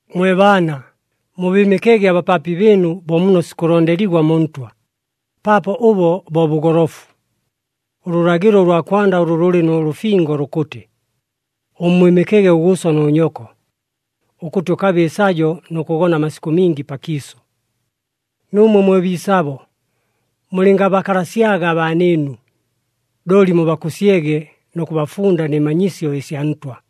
Mwe baana, mubɨɨmɨkege abapaapi bɨɨnu bo muno sikʉlondeligwa mu Ntwa, paapo ʉbo bo bʉgolofu. Ʉlʉlagɨlo ʉlwa kwanda ʉlʉ lʉlɨ nʉ lʉfingo lukʉtɨ, “Ʉmmwɨmɨkege ʉgʉʉso nʉ nyoko, ʉkʉtɨ ʉkabe ɨsajo nʉ kʉgona amasikʉ mingi pakiisʉ.” Nuumwe mwe biisabo, mulɨngabakalasyaga abaanɨɨnu, looli mubakʉsyege nʉ kʉbafunda nɨ manyisyo ɨsya Ntwa.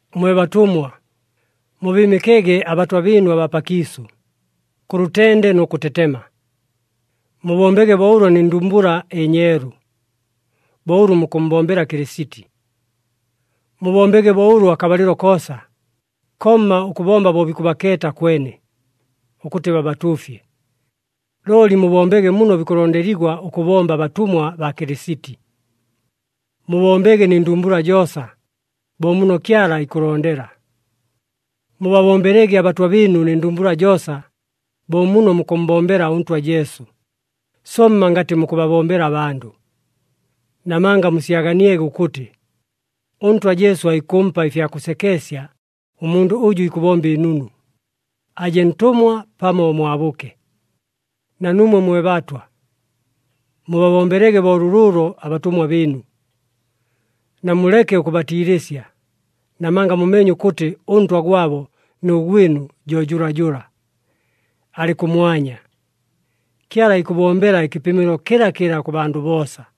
Mwe batʉmwa, mubɨɨmɨkege abatwa bɨɨnu abaa pakiisʉ, kʉ lʉtende nʉ kʉtetema. Mubombege bo ʉlo nɨ ndumbula ɨnyeelu, bo ʉlʉ mukʉmmbombela Kɨlɨsiti. Mubombege bo ʉlo akabalɨlo koosa, komma ʉkʉbomba bo bikʉbakeeta kwene, ʉkʉtɨ babatuufye. Looli mubombege muno bikʉlondeligwa ʉkʉbomba abatʉmwa baa Kɨlɨsiti. Mubombege nɨ ndumbula joosa, bo muno Kyala ikʉlondela. Mubabombelege abatwa bɨɨnu nɨ ndumbula joosa, bo muno mukʉmmbombela ʉNtwa Jesu, somma ngatɨ mukʉbabombela abandʉ. Namanga musyaganiege ʉkʉtɨ, ʉNtwa Jesu aikʉmpa ɨfya kʉsekeesya ʉmundʉ ʉjʉ ikʉbomba ɨnunu, aje ntʉmwa pamo mwabʉke. Na nuumwe mwe batwa, mubabombelege bo lʉlʉʉlo abatʉmwa bɨɨnu. Namuleke ʉkʉbatiilɨsya, namanga mumeenye ʉkʉtɨ ʉNtwa gwabo nʉ gwɨnu jo jʉlajʉla, alɨ kʉmwanya. Kyala ikʉbombela ɨkɨpɨmɨlo kɨlakɨla kʉ bandʉ boosa.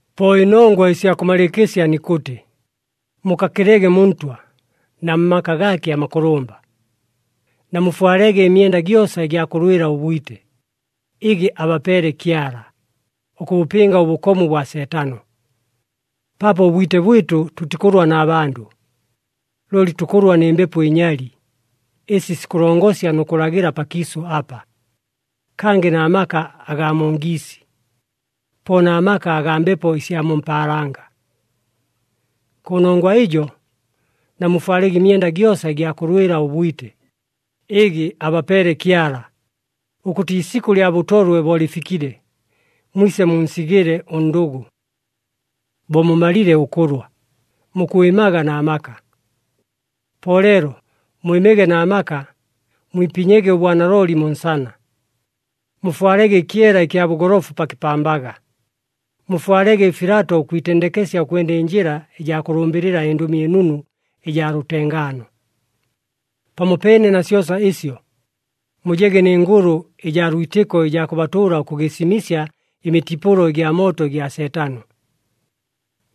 Po ɨnongwa ɨsya kʉmalɨɨkɨsya nikʉtɨ, mukakɨlege mu Ntwa, na mmaka gaake amakʉlʉmba. Namufwalege ɨmyenda gyosa ɨgya kʉlwɨla ʉbwite, ɨgɨ abapeele Kyala, ʉkʉbʉpɨnga ʉbʉkomu bwa Seetano. Paapo ʉbwite bwɨtʉ tʉtikʉlwa na bandʉ, looli tukʉlwa nɨ mbepo ɨnyali, ɨsi sikʉlongosya nʉ kʉlagɨla pakiisʉ apa, kangɨ na maka agaa mu ngiisi, po na maka agaa mbepo ɨsya mu mpaalanga. Kʉnongwa ɨjo, namufwalege ɨmyenda gyosa ɨgya kʉlwɨla ʉbwite, ɨgɨ abapeele Kyala, ʉkʉtɨ iisikʉ lya bʉtolwe bo lɨfikile, mwise munsigɨle ʉndʉgʉ. Bo mumalile ʉkʉlwa, mukwɨmaga na maka. Po leelo mwɨmege na maka, mwipinyege ʉbwanalooli mu nsana, mufwalege ɨkyela ɨkya bʉgolofu pa kɨpambaga, mufwalege ɨfilato ʉkwitendekesya ʉkwenda ɨnjɨla ɨjaa kʉlʉmbɨlɨla ɨNdʉmi ɨNunu ɨjaa lʉtengaano. Pamopeene na syosa ɨsyo, mujege nɨ ngʉlʉ ɨjaa lwitɨko ɨjaa kʉbatʉʉla ʉkʉgɨsimɨsya ɨmitipʉlo ɨgya mooto ɨgya Seetano.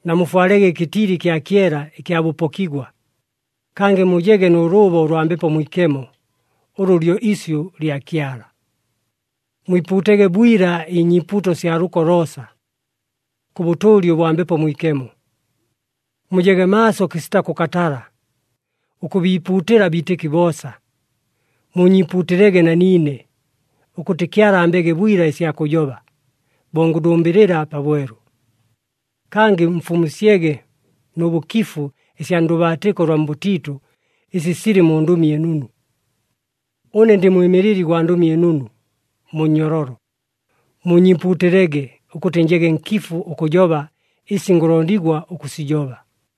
Namufwalege ɨkɨtili ɨkya kyela ɨkya bʉpokigwa, kangɨ mujege nʉ lʉʉbo lwa Mbepo Mwikemo, ʉlʉ lyo isyʉ lya Kyala. Mwipuutege bwila ɨnyiipuuto sya lʉko loosa, kʉ bʉtʉʉli ʉbwa Mbepo Mwikemo. Mujege maaso kɨsita kʉkatala, ʉkʉbiipuutɨla abiitɨki boosa. Muunyiipuutɨlege na niine, ʉkʉtɨ Kyala ambege bwila ɨsya kʉjoba, bo ngʉlʉmbɨlɨla pabwelu. Kangɨ mfumusyege nʉ bʉkifu ɨsya ndʉbaatɨko ʉlwa mbʉtiitʉ ɨsi silɨ mu Ndʉmi ɨNunu. Ʉne ndɨ mwɨmɨlɨli gwa Ndʉmi ɨNunu mu nnyololo. Muunyiipuutɨlege, ʉkʉtɨ njege nkifu ʉkʉjoba ɨsi ngʉlondigwa ʉkʉsijoba.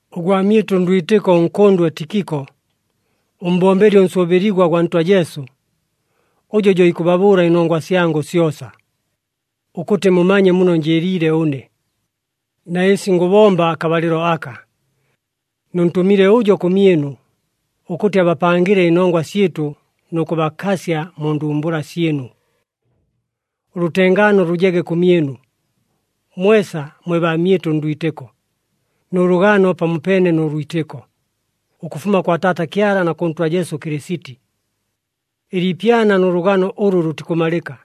Ʉgwamyɨtʉ ndwitɨko ʉnkʉndwe Tikiko, ʉmbombeli ʉnsʉʉbɨligwa gwa Ntwa Jesu, ʉjo jo ikʉbabʉʉla ɨnongwa syangʉ syosa, ʉkʉtɨ mumanye muno njɨɨliile ʉne, na ɨsi ngʉbomba akabalɨlo aka. Nʉntʉmile ʉjo kʉmyɨnu, ʉkʉtɨ abapangɨle ɨnongwa syɨtʉ nʉ kʉbakasya mu ndumbula syɨnu. Ʉlʉtengaano lʉjege kʉmyɨnu, mwesa mwe baamyɨtʉ ndwitɨko, nʉ lʉgano pamopeene nʉ lwitɨko, ʉkʉfuma kwa Taata Kyala na kʉ Ntwa Jesu Kɨlɨsiti. Ɨliipyana nʉ lʉgano ʉlʉ lʉtikʉmalɨka,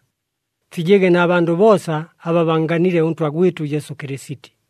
fijege na bandʉ boosa aba bannganile ʉNtwa gwɨtʉ Jesu Kɨlɨsiti.